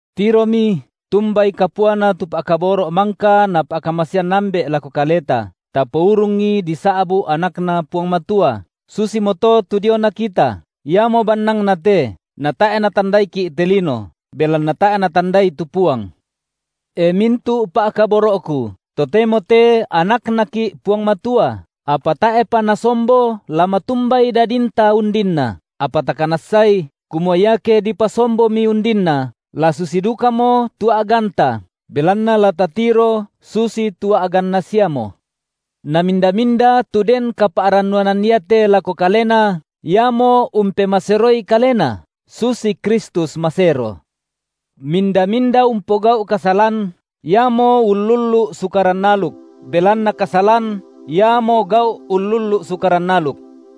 Tiromi, tumbai kapuana tu pa’kaboro’ mangka Napa’kamasean Ambe’ lako kaleta, tapourungi disa’bu’ anakNa Puang Matua; susimoto tu diona kita. Iamo bannangna te, natae’ natandaiki’ te lino, belanna tae’ natandai tu Puang. E mintu’ pa’kaboro’ku, totemo te anakNaki’ Puang Matua, apa tae’pa nasombo la matumbai dadinta undinna. Apa takanassai, kumua iake dipasomboMi undinna, la susi dukamo tu a’ganta, belanna la tatiro susitu a’ganNa siamo. Na minda-minda tu den kapa’rannuanan iate lako Kalena, iamo umpemaseroi kalena, susi Kristus masero. Minda-minda umpogau’ kasalan, iamo ullullu’ Sukaran aluk, belanna kasalan iamo gau’ ullullu’ Sukaran aluk.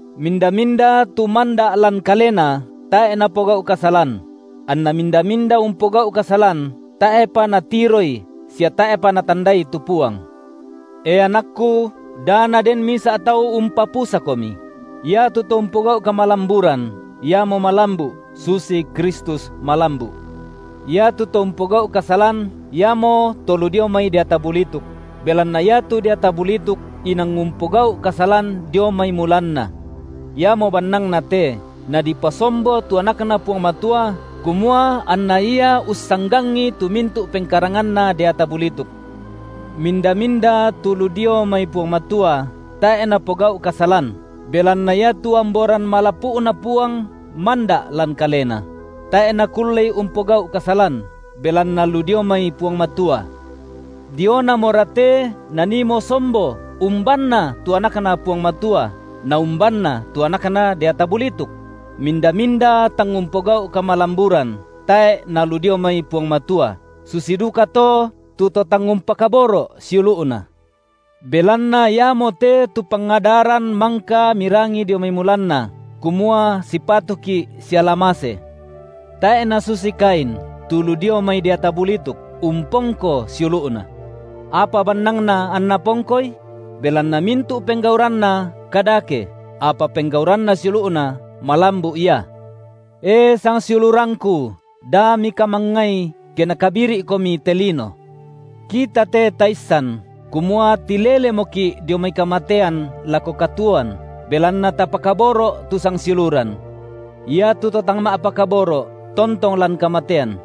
Minda-minda tu manda’ lan Kalena, tae’ napogau’ kasalan; anna minda-minda umpogau’ kasalan, tae’pa natiroI sia tae’pa natandai tu Puang. E anakku, da naden misa’ tau umpapusakomi: iatu to umpogau’ kamalamburan, iamo malambu’, susi Kristus malambu’; Iatu to umpogau’ kasalan, iamoto lu dio mai deata bulituk, belanna iatu deata bulituk inang umpogau’ kasalan dio mai mulanna. Iamo bannangnate, Nadipasombo tu AnakNa Puang Matua, kumua anNa Ia ussanggangi tu mintu’ pengkaranganna deata bulituk. Minda-minda tu lu dio mai Puang Matua, tae’ napogau’ kasalan, belanna iatu amboran malapu’Na Puang manda’ lan kalena; tae’ nakullei umpogau’ kasalan, belanna lu dio mai Puang Matua. Dionamora te naniimo sombo umbanna tu anakNa Puang Matua na umbanna tu anakna deata bulituk; minda-minda tang umpogau’ kamalamburan, tae’ nalu dio mai Puang Matua, susi dukato tu to tang umpakaboro’ siulu’na. Belanna iamote tu pangadaran mangka mirangi dio mai mulanna, kumua sipatuki’ siala mase. Tae’ nasusi Kain, tu lu dio mai deata bulituk, umpongko siulu’na. Apa bannangna anna pongkoi? Belanna mintu’ penggauranna kadake, apa penggauranna siulu’na malambu’ ia. E sangsiulurangku, da mikamangngai, ke nakabiri’komi te lino. Kita te taissan, kumua tilelemoki’ dio mai kamatean lako katuoan, belanna tapakaboro’ tu sangsiuluran. Iatu to tang ma’pakaboro’, tontong lan kamatean.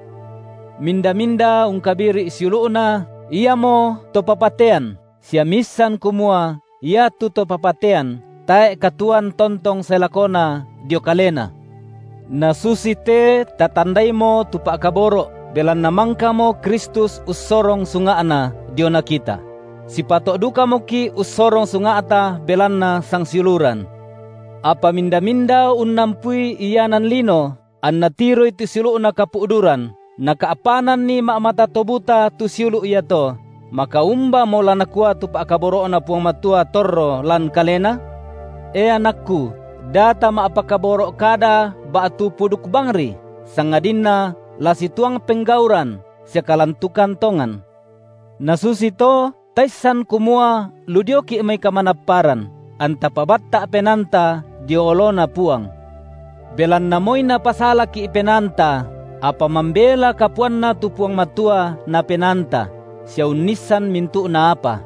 Minda-minda ungkabiri’ siulu’na, iamoto papatean, sia miissan kumua iatu to papatean, tae’ katuoan tontong sae lakona dio kalena. Nasusite tatandaimo tu pa’kaboro’, belanna mangkamo Kristus ussorong sunga’Na, diona kita; sipato’ dukamoki’ ussorong sunga’ta belanna sangsiuluran. Apa minda-minda unnampui ianan lino, anna tiroi tu siulu’na kapu’duran, naka’pananni ma’mata to buta tu siulu’ iato, maka umbamo la nakua tu pa’kaboro’Na Puang Matua torro lan kalena? E anakku, da tama’pakaboro’ kada ba’tu puduk bangri, sangadinna la situang penggauran sia kalantukan tongan. Nasusito taissan, kumua lu dioki’ mai kamanapparan, anta pabatta’ penaanta dio oloNa Puang; belanna moi napasalaki’ penaanta, apa mambela kapuanNa tu Puang Matua na penaannta, sia unnissan mintu’na apa.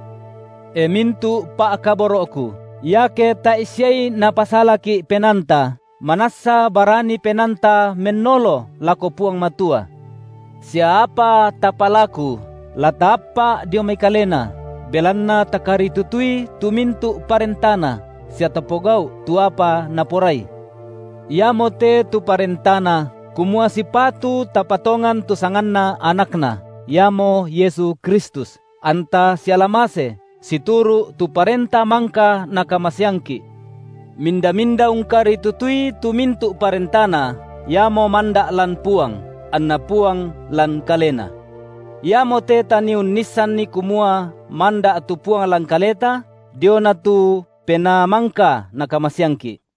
E mintu’ pa’kaboro’ku, iake tae’ siai napasalaki’ penaanta, manassa barani penaanta mennolo lako Puang Matua; sia apa tapalaku, la taappa’ dio mai Kalena, belanna takaritutui tu mintu’ parentaNa sia tapogau’ tu apa Naporai. Iamote tu parentaNa, kumua sipatu tapatongan tu sanganNa AnakNa, Iamo Yesu Kristus, anta siala mase, situru’ tu parenta mangka Nakamaseangki’. Minda-minda ungkaritutui tu mintu’ parentaNa, iamo manda’ lan Puang, anNa Puang lan kalena. Iamote tanii unnissanni kumua manda’ tu Puang lan kaleta, diona tu Penaa mangka Nakamaseangki’.